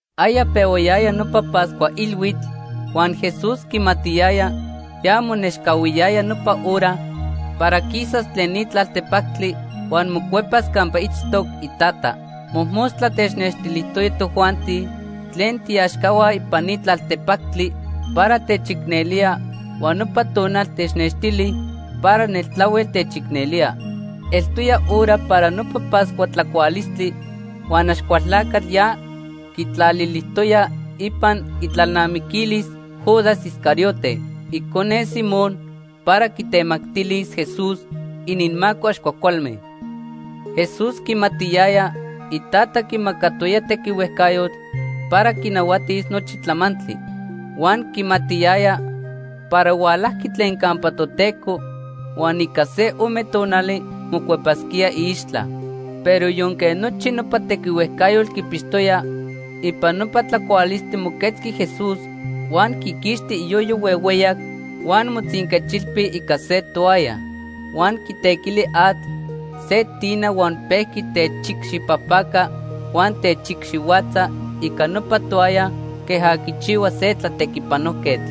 Aya pehuayaya nopa Pascua Ilhuitl huan Jesús quimatiyaya ya monechcahuiyaya nopa hora para quisas tlen ni tlaltepactli huan mocuepas campa itztoc iTata. Mojmostla technextilijtoya tojuanti tlen tiiaxcahua ipan ni tlaltepactli para techicnelía huan nopa tonal technextili para neltlahuel techicnelía. Eltoya hora para nopa Pascua tlacualistli huan Axcualtlacatl ya quitlalilijtoya ipan itlalnamiquilis Judas Iscariote, icone Simón, para quitemactilis Jesús ininmaco ax cuajcualme. Jesús quimatiyaya Itata quimacatoya tequihuejcayotl para quinahuatis nochi tlamantli. Huan quimatiyaya para hualajqui tlen campa Toteco huan ica se ome tonali mocuepasquía iixtla. Pero yonque nochi nopa tequihuejcayotl quipixtoya, ipan nopa tlacualistli moquetzqui Jesús, huan quiquixti iyoyo huehueyac huan motzinquechilpi ica se toalla. Huan quitequili atl se tina huan pejqui techicxipajpaca huan techicxihuatza ica nopa toalla queja quichihua se tlatequipanojquetl.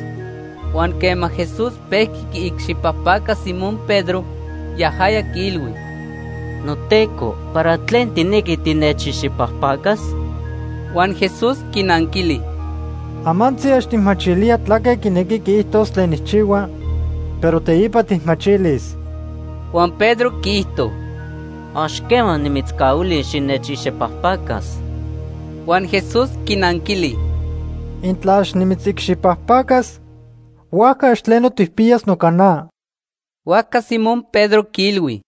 Huan quema Jesús pejqui quiicxipajpaca Simón Pedro, yajaya quiilhui: ―NoTeco, ¿para tlen tijnequi tinechicxipajpacas? Huan Jesús quinanquili: ―Amantzi ax tijmachilía tlaque quinequi quiijtos tlen nijchihua, pero teipa tijmachilis. Huan Pedro quiijto: ―Ax quema nimitzcahuilis xinechicxipajpacas. Huan Jesús quinanquili: ―Intla ax nimitzicxipajpacas, huajca ax tleno tijpiyas noca na. Huajca Simón Pedro quiilhui: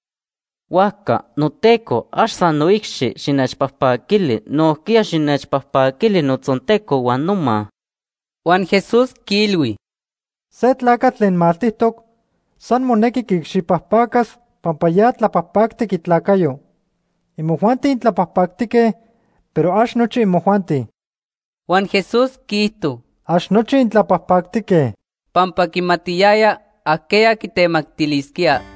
―Huajca, noTeco, ax san noicxi xinechpajpaquili, nojquiya xinechpajpaquili notzonteco huan noma. Huan Jesús quiilhui: ―Se tlacatl tlen maltijtoc san monequi quiicxipajpacas pampa ya tlapajpactic itlacayo. Imojuanti intlapajpactique, pero ax nochi imojuanti. Huan Jesús quiijto: “Ax nochi intlapajpactique” pampa quimatiyaya ajqueya quitemactilisquía.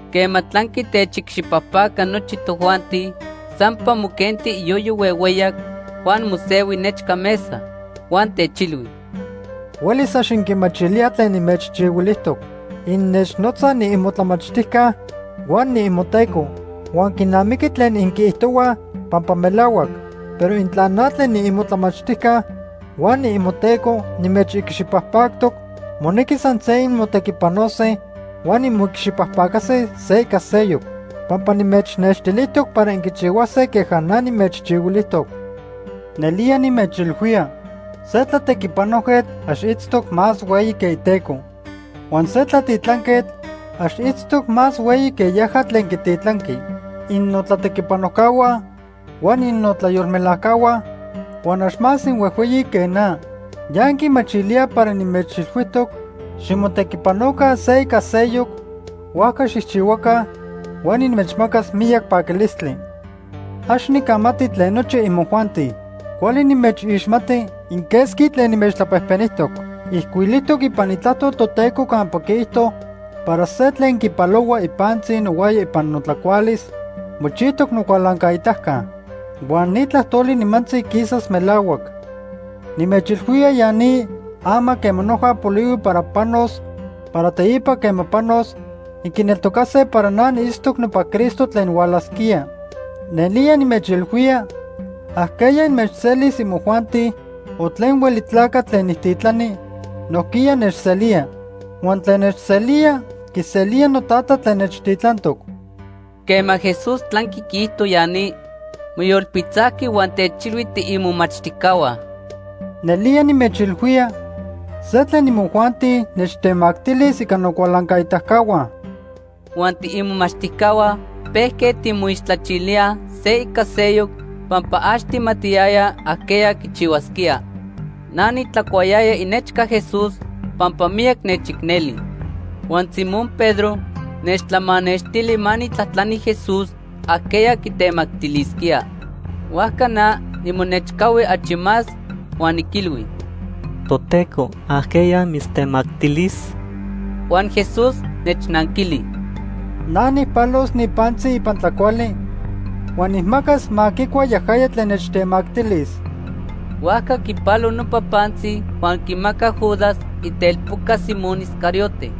Quema tlanqui techicxipajpaca nochi tojuanti, sampa moquenti iyoyo huehueyac huan mosehui nechca mesa. Huan techilhui: ―Huelis ax inquimachilíaj tlen nimechchihuilijtoc. Innechnotzaj niimotlamachtijca huan niimoTeco. Huan quinamiqui tlen inquiijtohuaj pampa melahuac. Pero intla na tlen niimotlamachtijca huan niimoTeco nimechicxipajpactoc, monequi san se inmotequipanose huan inmoicxipajpacase se ica seyoc. Pampa nimechnextilijtoc para inquichihuase queja na nimechchihuilijtoc. Nelía nimechilhuía, se tlatequipanojquetl ax itztoc más hueyi que iteco. Huan se tlatitlanquetl ax itztoc más hueyi que yaja tlen quititlanqui. Innotlatequipanojcahua huan innotlayolmelajcahua huan ax más inhuejhueyi que na. Ya inquimachilíaj para nimechilhuijtoc ximotequipanoca se ica seyoc, huajca xijchihuaca huan inmechmacas miyac paquilistli. “Ax nicamati tlen nochi imojuanti. Cuali nimechixmati inquesqui tlen nimechtlapejpenijtoc. Ijcuilijtoc ipan Itlajtol Toteco campa quiijto para se tlen quipalohua ipantzi nohuaya ipan notlacualis, mochijtoc nocualancaitaca. Huan ni tlajtoli nimantzi quisas melahuac. Nimechilhuía ya ni ama quema noja polihui para panos para teipa quema panos, inquineltocase para na niitztoc nopa Cristo tlen hualasquía. Nelía nimechilhuía, ajqueya inmechselis imojuanti o tlen hueli tlacatl tlen nijtitlani, nojquiya nechselía. Huan tlen nechselía, quiselía noTata tlen nechtitlantoc.” Quema Jesús tlanqui quiijto ya ni, moyolpitzajqui huan techilhui tiimomachtijcahua: ―Nelía nimechilhuía, se tlen imojuanti nechtemactilis ica nocualancaitacahua. Huan tiimomachtijcahua pejque timoixtlachilíaj se ica seyoc pampa ax tijmatiyayaj ajqueya quichihuasquía. Na nitlacuayaya inechca Jesús pampa miyac nechicneli. Huan Simón Pedro nechtlamanextili ma nijtlajtlani Jesús ajqueya quitemactilisquía. Huajca na nimonechcahui achi más huan niquilhui: ―Toteco, ¿ajqueya mitztemactilis? Huan Jesús nechnanquili: ―Na nijpalos ni pantzi ipan tlacuali huan nijmacas ma quicua yajaya tlen nechtemactilis. Huajca quipalo nopa pantzi huan quimacac Judas, itelpoca Simón Iscariote.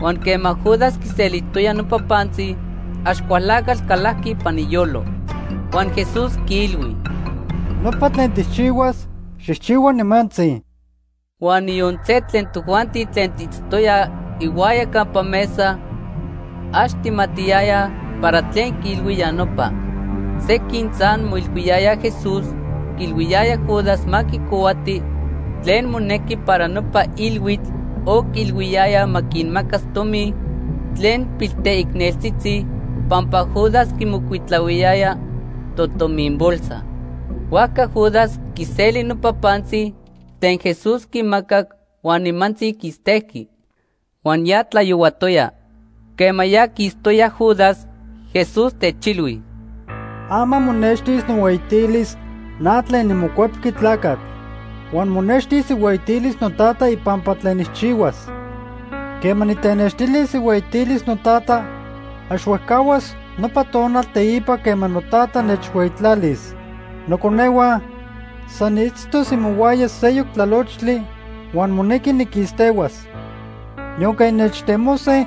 Huan quema Judas quiselijtoya nopa pantzi, Axcualtlacatl calajqui ipan iyolo. Huan Jesús quiilhui: ―Nopa tlen tijchihuas, xijchihua nimantzi. Huan niyon se tlen tojuanti tlen tiitztoyaj ihuaya campa mesa ax tijmatiyayaj para tlen quiilhui ya nopa. Sequin san moilhuiyayaj Jesús quiilhuiyaya Judas ma quicohuati tlen monequi para nopa ilhuitl o quiilhuiyaya ma quinmacas tomi tlen pilteicneltzitzi pampa Judas quimocuitlahuiyaya totomin bolsa. Huajca Judas quiseli nopa pantzi tlen Jesús quimacac huan nimantzi quistejqui. Huan ya tlayohuatoya. Quema ya quistoya Judas, Jesús techilhui: ―Ama monextis nohueyitilis na tlen niMocuepqui Tlacatl. Huan monextis ihueyitilis noTata ipampa tlen nijchihuas. Quema nitenextilis ihueyitilis noTata, ax huejcahuas nopa tonal teipa quema noTata nechhueyitlalis. Noconehua, san niitztos imohuaya seyoc tlalochtli huan monequi niquistehuas. Yonque innechtemose,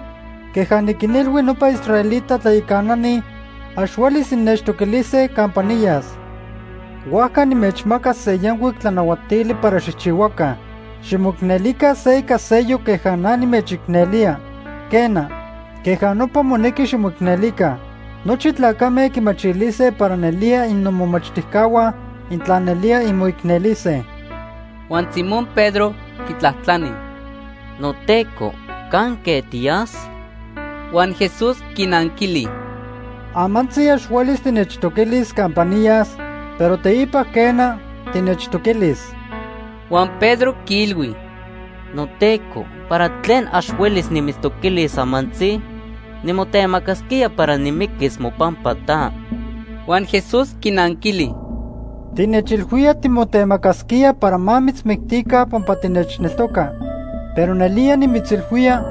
queja niquinilhui nopa israelita tlayacanani, ax huelis innechtoquilise campa niyas. Huajca nimechmaca se yancuic tlanahuatili para xijchihuaca: Ximoicnelica se ica seyoc queja na nimechicnelía. Quena, queja nopa monequi ximoicnelica. Nochi tlacame quimachilise para nelía innomomachtijcahua intla nelía inmoicnelise. Huan Simón Pedro quitlajtlani: ―NoTeco, ¿canque tiyas? Huan Jesús quinanquili: ―Amantzi ax huelis tinechtoquilis campa niyas, pero teipa quena, tinechtoquilis. Huan Pedro quiilhui: ―NoTeco, ¿para tlen ax huelis nimitztoquilis amantzi? Nimotemacasquía para nimiquis mopampa ta. Huan Jesús quinanquili: ―Tinechilhuía timotemacasquía para ma mitzmictica pampa tinechneltoca. Pero nelía nimitzilhuía,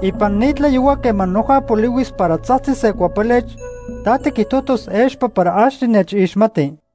ipan ni tlayohua quema noja polihuis para tzajtzis se cuapelech, ta tiquijtojtos expa para ax tinechixmati.